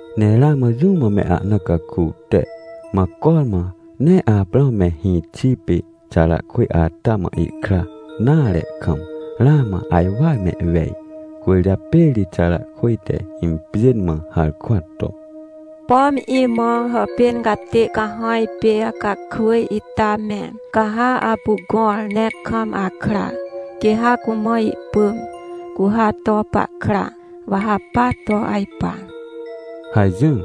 Ne ramã jũ mã me ahna caku te, mã cormã nee Aprãw me hĩxi pê Xarakwỳj ata mã ihkra nare kam, ramã ajwar mehwej. Cwỳrjapê ri Xarakwỳj te impjên mã harkwa to: — Pom imã hàpên catê cahãj pê Hacakwỳj ita me, ca ha apu gõr ne kam akra, quê ha cumã ihpỳm, cu ha to pahkra, wa ha pa to ajpa — hajỹr.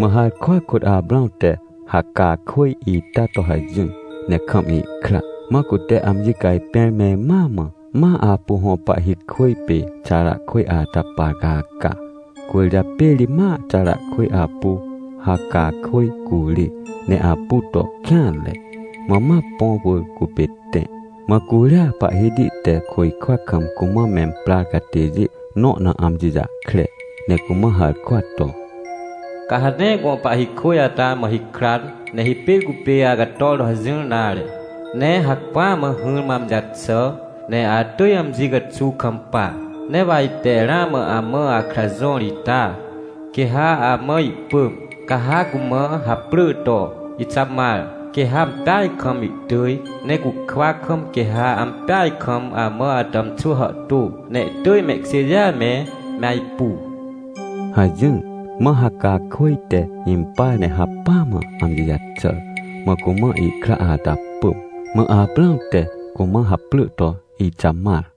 Mã harkwa kôt Aprãw te Hacakwỳj ita to hajỹr ne kam ihkra. Mã cute amji cajpẽr me mãa mã, ma apu hõ pahhi kwỳj pê Xarakwỳj ata par caca. Cwỳrjapê ri ma Xarakwỳj apu Hacakwỳj curê ne apu to kêanre, mã ma põ wỳr cupê tẽ. Mã curia Pahhiti te côjkwa kam cumã memprar catêjê nõ na amji jahkre ne cumã harkwa to: — Ca ha nee gõ pahhi kwỳj ata mã hikran, ne hipêr cupê acator to hajỹr nare. Ne hacpỹa mã hỹrmã amji jaxà, ne atỳj amji caxuw kampa. Ne wa ite ramã amã akra jõr ita, quê ha amã ihpỳm, ca ha cumã haprỳ to Ixamar. Quê ha ampeaj kam ihtỳj, ne cukwa kam quê ha ampeaj kam amã atàmxwỳ hàhtô, ne ihtỳj mehkjêjêa me, me ajpu — hajỹr. Mã Hacakwỳj te impar ne hacpỹa mã amji jaxàr. Mã cumã ihkra ata pỳm, mã Aprãw te cumã haprỳ to Ixamar.